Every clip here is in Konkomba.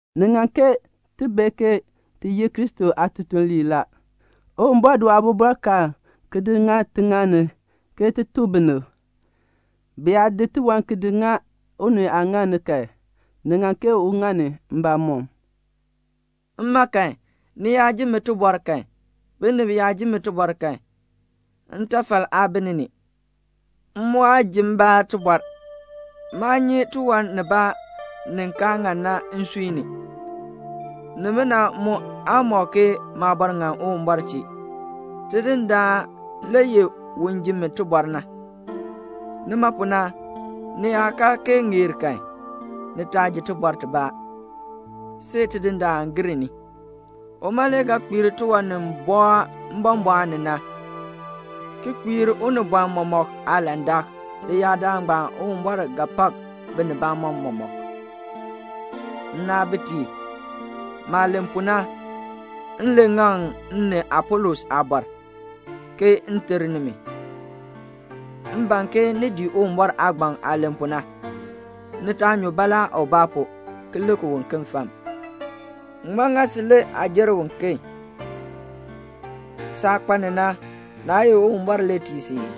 Ni ŋan ke ni bee ke ti ye Kristo aatutuliib la. Uwumbɔr di waabɔbɔrkaan ki di ŋa tiŋaal ni ke ti tuk binib. Bi yaa di tiwan ki di ŋa unii aaŋaal ni kan, ni ŋan ke un ŋa ni mbamɔm. Mma kan, ni yaa ji mi tibɔr kan, binib yaa ji mi tibɔr kan, ntafal aa bi ni ni. M mu aa ji mbaa tibɔr. Maa nyi tiwan nibaa ni kaa ŋan na nsui ni. Nimina mu aa mɔk ke maabɔr ŋan Uwumbɔr chee. Tidindaan le ye un ji mi tibɔr na. Nima pu na, ni yaa kaa kee ŋeer kan, ni taa ji tibɔr tibaa, see Tidindaan gir ni. Uma le ga kpiir tiwan ni bɔɔ mbɔmbɔɔn ni na, ki kpiir unibɔn mɔmɔk aalandak. Leyaadaal ngbaan Uwumbɔr ga pak binibamɔm mɔmɔk. Nnaabitiib, maah len pu na, m len ŋaŋ m ni Apolos aabɔr, ke m ter nimi. M ban ke ni dii Uwumbɔr aagbaŋ aah len pu na. Ni taa nyu baalaa ubaa pu ki lik uken fam. Ŋmaa ŋa si le aa jer uken? Saah kpa ni na, naa ye Uwumbɔr le tii si ii?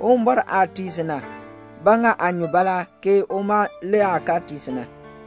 Uwumbɔr aah tii si na, ba ŋa aa nyu baalaa ke uma le aah kaa tii si na?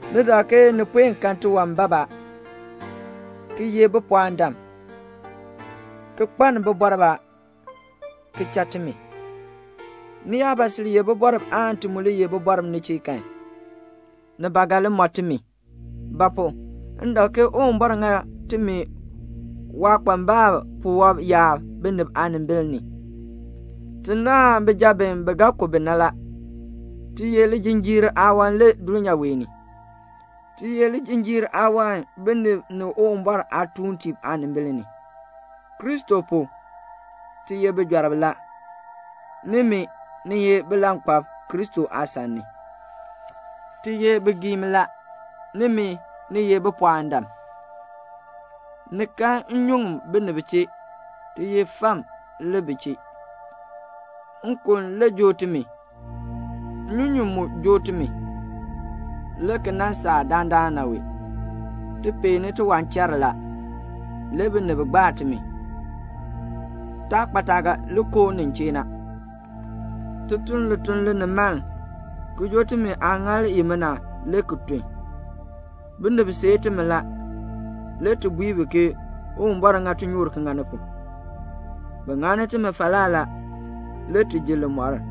Ni dak ke ni puen kan tiwan bab a, ki ye bipɔɔndam, ki kpaln bibɔrb a, ki cha timi. Ni yaa ba sil ye bibɔrb aan ti mu li ye bibɔrb ni chee kan, ni ba ga li mɔ timi. Ba pu? m dak ke Uwumbɔr ŋa timi waakpambalb puwɔb yaab binib aanimbil ni. Ti naahn bijab bi, bi ga ku bi na la. Ti ye lijinjiir aawan le dulnyaa wee ni. Ti ye lijinjiir aawan binib ni Uwumbɔr aatuuntiib aanimbil ni. Kristo pu, ti ye bijɔrb la. Nimi, ni ye bilankpalb Kristo aasan ni. Ti ye bigiim la; nimi, ni ye bipɔɔndam. Ni kan nnyuŋ binib chee; ti ye fam le bi chee. Nkon le joo timi, nnyunyun mu joo timi, le ki nan saa dandana wee. Ti peeni tiwanchar la. Le binib gbaa timi. Taa kpa taah ga li koo nin chee na. Ti tun lituln linimaln, ki joo timi aaŋaal imina le ki tun. Binib seei timi la, le ti bui bi ke "Uwumbɔr ŋa tinyoor ki ŋa ni pu." Bi ŋani timi falaa la, le ti ji limɔr.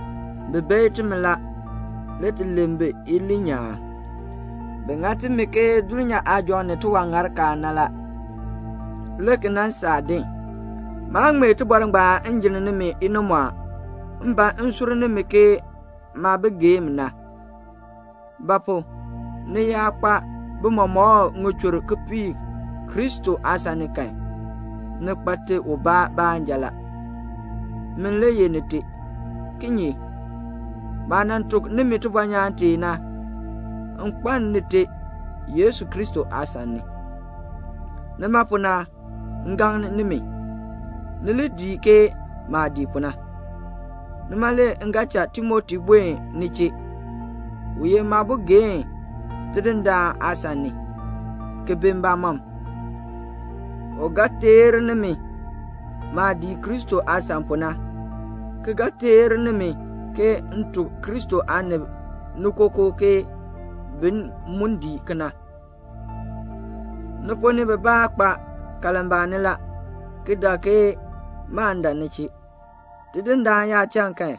Bi beei timi la, le ti len bi iliin nyaan. Bi ŋa timi ke dulnyaa aajɔŋ, ni tiwaŋarkaal na la, le ki nan saa din. Maa ŋmee tibɔr ngbaan m jinn nimi inimɔɔn. M ban m sur nimi ke maabigeem na. Ba pu? ni yaa kpa bimɔmɔkb ŋichur kipiik Kristo aasan ni kan, ni kpa te ubaa baanja la. Min le ye nite. Kinye? maah nan tuk nimi tibɔnyaan tee na, m kpaln nite Yesu Kristo aasan ni. Nima pu na, m gaŋ nimi, ni li dii ke maah dii pu na. Nima le m ga cha Timoti buen ni chee. U ye maabogeen Tidindaan aasan ni, ki bi mbamɔm. U ga teer nimi maah dii Kristo aasan pu na, ki ga teer nimi ke m tuk Kristo aanib ni kookoo ke bin mu dii kena. Ni ponn ni bibaa kpa kalmbaani la, ki dak ke maan dan ni chee. Tidindaan yaa cha kan,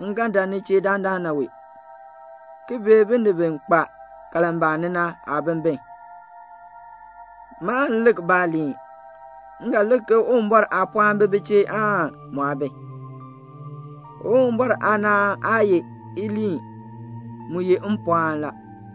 m ga dan ni chee dandana wee, ki bee binib bi kpa kalmbaani na aabimbin. Maan lik baaliin. M ga lik ke Uwumbɔr aapɔɔn bi bi chee aan mu aa bi. Uwumbɔr aanaan aa ye iliin. Mu ye mpɔɔn la.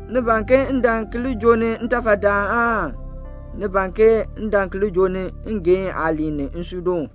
Ni ban ke m dan ki li joo ni ntafadaan aan ni ban ke m dan ki li joo ni ngeehn aaliin ni nsuudoon?